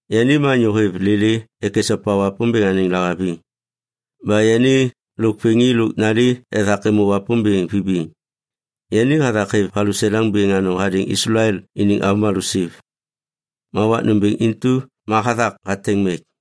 Yani ma anyô hêv lêlê ek esopa Wapômbêŋ anêŋ lahaviŋ. Ba yani lôk vêŋi lôk nali ethak êmô Wapômbêŋ vibiŋ. Yani hathak hêv valuseleŋ bêŋ anôŋ hadêŋ Islael iniŋ avômalô siv, ma wak nômbêŋ intu ma hathak hateŋ mek.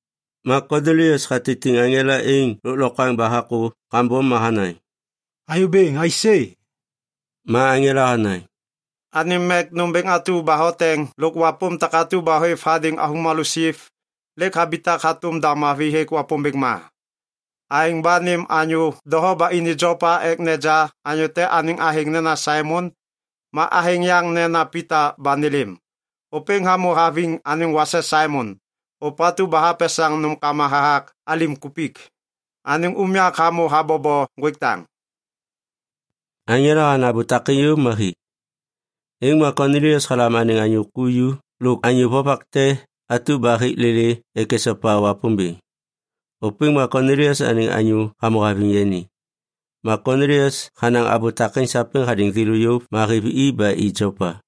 Ma Konilias hatitiŋ aŋela êŋ lôklokwaŋ ba hakô kambom ma hanaŋ, “Anyô Bêŋ, aisê?” Ma aŋela hanaŋ, “Anêm mek nômbêŋ atu ba hoteŋ lôk wapôm takatu ba hôêv hadêŋ avômalô siv, lêk habitak hatôm da mavi hêk Wapômbêŋ ma. Aêŋ ba nêm anyô doho ba ini Jopa ek neja anyô te anêŋ athêŋ nena Saimon, ma athêŋ yaŋ nena Pita ba nêlêm. Ôpêŋ hamô haviŋ anêŋ wase Saimon, ôpatu ba hapesaŋ nômkama hathak alim kupik. Anêŋ unyak hamô habobo ŋgwêk daŋ.” Aŋela hanaŋ abô takêŋ yôv ma hi. Êŋ ma Konilias halam anêŋ anyô ku ju lôk anyô vovak te atu ba hêk lêlê ek esopa Wapômbêŋ. Ôpêŋ ma Konilias anêŋ anyô hamô haviŋ yani. Ma Konilias hanaŋ abô takêŋ sapêŋ hadêŋ thêlô yôv, ma hêv i ba i Jopa.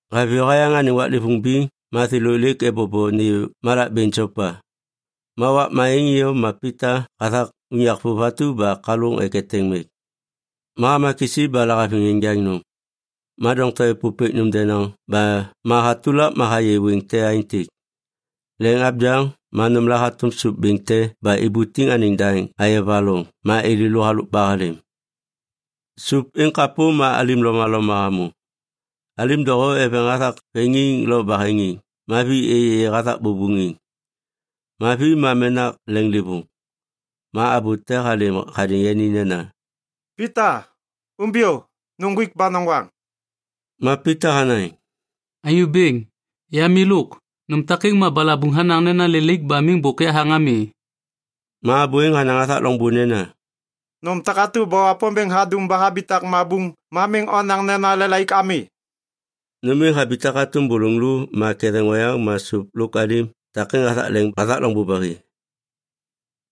Haviyô hayaŋ anêŋ waklêvôŋ biŋ ma thêlô lêk ebobo nêyô malak bêŋ Jopa. Ma wakma êŋ iyom ma Pita hathak unyak vôv atu ba kalôŋ ek eteŋ mek. Ma hama kisi ba lahaviŋ enjaŋ nôm. Ma doŋtom êpôpêk nôm denaŋ ba ma hatulak ma hayê wêŋ te aêntêk. Leŋ abyaŋ ma nômla hatôm sôp bêŋ te ba ibutiŋ anêŋ daŋ ayova loŋ ma êlêlô halôk ba halêm. Sôp êŋ kapô ma alim lomaloma hamô. Alim doho eveŋ hathak veŋiŋ lo baheŋiŋ ma vi êyêyê hathak bôbôŋiŋ ma vi ma menak leŋlêvôŋ. Ma abô te halêm hadêŋ yani nena, “Pita, umbiyô. Nuŋgwik ba noŋgwaŋ.” Ma Pita hanaŋ, “Anyô Bêŋ, ya milôk. Nôm takêŋ ma balabuŋ hanaŋ nena lelaik ba miŋ bôk yahaŋ ami.” Ma abô êŋ hanaŋ hathak loŋbô nena, “Nôm takatu ba Wapômbêŋ hadum ba habitak mabuŋ ma miŋ onaŋ nena lelaik ami.” Nôm êŋ habitak hatôm bôlôŋ lô ma ketheŋ oyaŋ ma sôp lôk alim takêŋ hathak leŋ hathak loŋbô ba hi.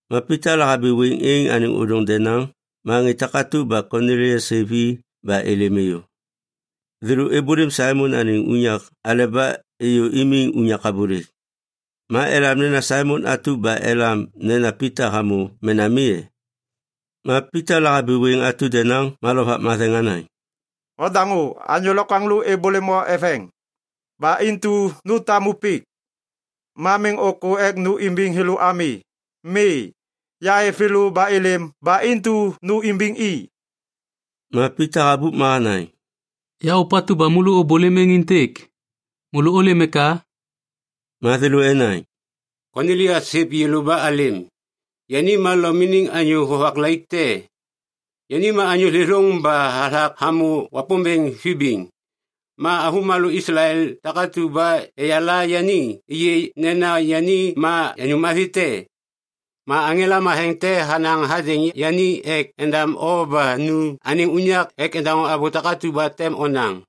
Ma Pita lahabi wêŋ êŋ anêŋ ôdôŋ denaŋ ma ŋê takatu ba Konilias hêv i ba êlêm êyô. Thêlô êbôlêm Saimon anêŋ unyak aleba êyô imiŋ unyak abôlêk. Ma elam nena Saimon atu ba elam nena Pita hamô mena mi e? Ma Pita lahabi wêŋ atu denaŋ ma Lovak Matheŋ hanaŋ, “Ondaŋô, anyô lokwaŋlô êbôlêm o eveŋ. Ba intu nu tamu pik. Ma miŋ ôkô ek nu imbiŋ thêlô ami. Mi, yahêv thêlô ba êlêm ba intu nu imbiŋ i.” Ma Pita habup ma hanaŋ, “Ya ôpatu ba môlô ôbôlêm êŋ êntêk. Môlô ôlêm eka?” Ma thêlô enaŋ, “Konilias hêv yêlô ba alêm. Yani ma Lom iniŋ anyô vovak laik te. Yani ma anyô thêthôŋ ba hathak hamô Wapômbêŋ vibiŋ. Ma avômalô Islael takatu ba eyala yani êyê nena yani ma anyô mavi te. Ma aŋela matheŋ te hanaŋ hadêŋ yani ek endam o ba nu anêŋ unyak ek endaŋô abô takatu ba tem onaŋ.”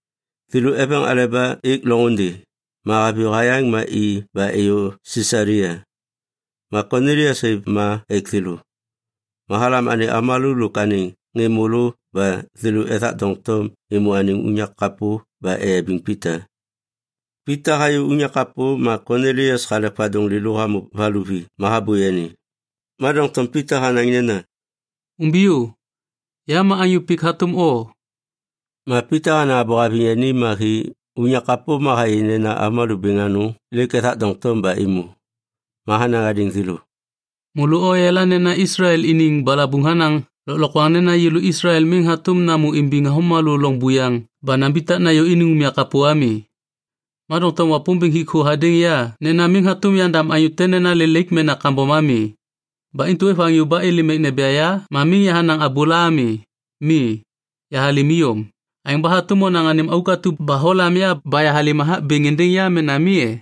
Thêlô eveŋ aleba êk loŋôndê, ma haviyô hayaŋ ma i ba êyô Sisalia. Ma Konilias hêv ma ek thêlô. Ma halam anêŋ avômalô lôk anêŋ ŋê môlô ba thêlô ethak doŋtom êmô anêŋ unyak kapô ba eyabiŋ Pita. Pita hayô unyak kapô ma Konilias halek vadôŋ lêlô hamô valuvi ma habô yani. Ma doŋtom Pita hanaŋ nena, “Umbiyô, ya ma anyô pik hatôm o.” Ma Pita hanaŋ abô haviŋ yani ma hi unyak kapô ma hayê nena avômalô bêŋ anôŋ lêk ethak doŋtom ba êmô. Ma hanaŋ hadêŋ thêlô, “Môlô oyala nena Islael iniŋ balabuŋ hanaŋ lôklokwaŋ nena yêlô Islael miŋ hatôm namô imbiŋ avômalô loŋ buyaŋ ba nambitak nayô iniŋ unyak kapô ami. Ma doŋtom Wapômbêŋ hik thô hadêŋ ya nena miŋ hatôm yandam anyô te nena lelaik mena kambom ami. Ba intu ôêv anyô ba êlêm ek neja ya, ma miŋ yahanaŋ abôla ami. Mi, yahalêm iyom. Aêŋ ba hatôm onaŋ anêm auk atu ba holam ya ba yahalêm hathak bêŋ êndêŋ ya mena mi e?”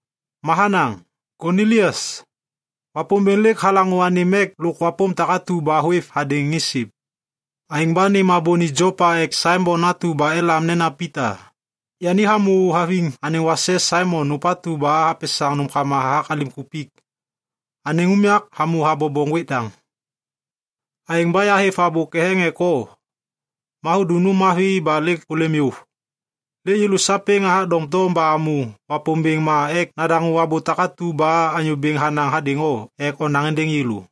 Ma hanaŋ, ‘Konilias, Wapômbêŋ lêk halaŋô anêm mek lôk wapôm takatu ba hôêv hadêŋ ŋê siv. Aêŋ ba nêm abô ni Jopa ek Saimon atu ba elam nena Pita. Yani hamô haviŋ anêŋ wase Saimon ôpatu ba hapesaŋ nômkama hathak alim kupik. Anêŋ unyak hamô habobo ŋgwêk daŋ.’ Aêŋ ba yahêv abô ketheŋ ek o, ma hudum nôm mavi ba lêk hôlêm yôv. Lêk yêlô sapêŋ athak doŋtom ba amô Wapômbêŋ ma ek nadaŋô abô takatu ba Anyô Bêŋ hanaŋ hadêŋ o ek onaŋ êndêŋ yêlô.”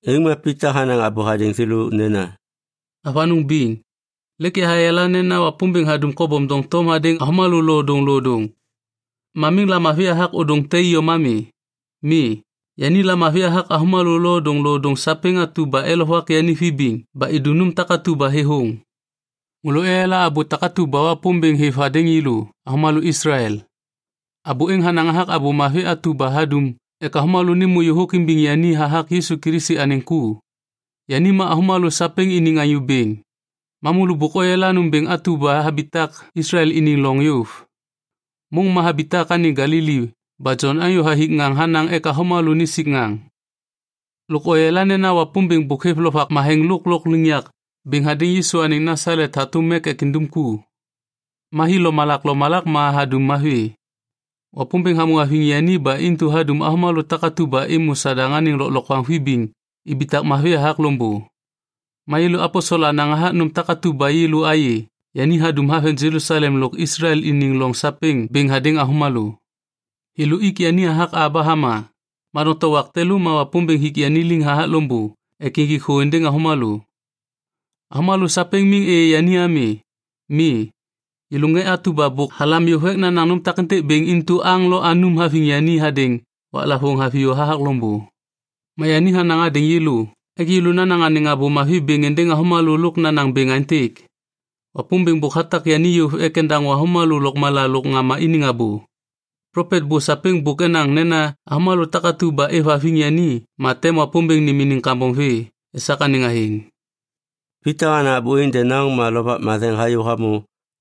Êŋ ma Pita hanaŋ abô hadêŋ thêlô nena, “Avanôŋ biŋ, lêk yahayala nena Wapômbêŋ hadum kobom doŋtom hadêŋ avômalô lodôŋlodôŋ. Ma miŋ lamavi hathak ôdôŋ te iyom ami. Mi, yani lamavi hathak avômalô lodôŋlodôŋ sapêŋ atu ba elovak yani vibiŋ ba idum nôm takatu ba thêthôŋ. Môlô oyala abô atu ba Wapômbêŋ hêv hadêŋ yêlô avômalô Islael. Abô êŋ hanaŋ hathak Abô Mavi atu ba hadum ek avômalô nêmô yôhôk imbiŋ yani hathak Yisu Kilisi anêŋ ku. Yani ma avômalô sapêŋ iniŋ Anyô Bêŋ. Ma môlô bôk oyala nômbêŋ atu ba habitak Islael iniŋ loŋ yôv. Môŋ ma habitak anêŋ Galili ba Jon anyô hathik ŋaŋ hanaŋ ek avômalô nisik ŋaŋ. Lôk oyala nena Wapômbêŋ bôk hêv Lovak Matheŋ lôk lôkliŋyak bêŋ hadêŋ Yisu anêŋ Nasalet hatôm mek ek indum ku. Ma hi lomalak lomalak ma hadum mavi. Wapômbêŋ hamô haviŋ yani ba intu hadum avômalô takatu ba êmô Sadaŋ anêŋ lôklokwaŋ vibiŋ ibitak mavi hathak loŋbô. “Ma yêlô aposel anaŋ hathak nôm takatu ba yêlô ayê yani hadum haveŋ Jelusalem lôk Islael iniŋ loŋ sapêŋ bêŋ hadêŋ avômalô. Thêlô ik yani hathak a ba hama, ma doŋtom wak te lô ma Wapômbêŋ hik yani liŋ hathak loŋbô ek injik i thô êndêŋ avômalô. Avômalô sapêŋ miŋ êyê yani ami. Mi, yêlô ŋê takatu ba bôk halam yôv ek nanaŋ nôm takêntêk bêŋ intu aŋ lo anum haviŋ yani hadêŋ waklavôŋ haviyô hathak loŋbô. Ma yani hanaŋ hadêŋ yêlô ek yêlô nanaŋ anêŋ Abô Mavi bêŋ êndêŋ avômalô lôk nanaŋ bêŋ aêntêk, ‘Wapômbêŋ bôk hatak yani yôv ek endaŋô avômalô lôkmala lôk ŋama iniŋ abô.’ Plopet bô sapêŋ bôk enaŋ nena avômalô takatu ba êvhaviŋ yani ma tem Wapômbêŋ nêm iniŋ kambom vê esak anêŋ athêŋ.” Pita hanaŋ abô êŋ denaŋ ma Lovak Matheŋ hayô hamô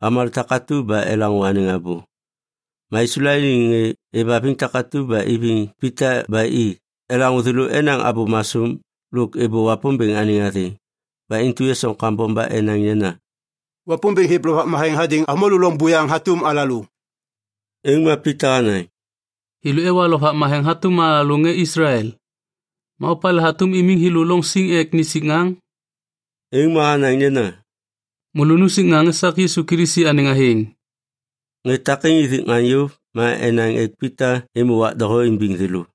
avômalô takatu ba elaŋô anêŋ abô. Ma Islael iniŋ ŋê êvhaviŋ takatu ba iviŋ Pita ba i, elaŋô thêlô enaŋ abô masôm lôk êbô Wapômbêŋ anêŋ athêŋ. Ba intu esoŋ kambom ba enaŋ nena, “Wapômbêŋ hêv Lovak Matheŋ hadêŋ avômalô loŋ buyaŋ hatôm alalô.” Êŋ ma Pita hanaŋ, “Thêlô ewa Lovak Matheŋ hatôm alalô ŋê Islael. Ma opalê hatôm imiŋ thêlô loŋ siŋ ek nisik ŋaŋ?” Êŋ ma hanaŋ nena, “Môlô nusik ŋaŋ esak Yisu Kilisi anêŋ athêŋ.” Ŋê takêŋ ithik ŋaŋ yôv ma enaŋ ek Pita êmô wak doho imbiŋ thêlô.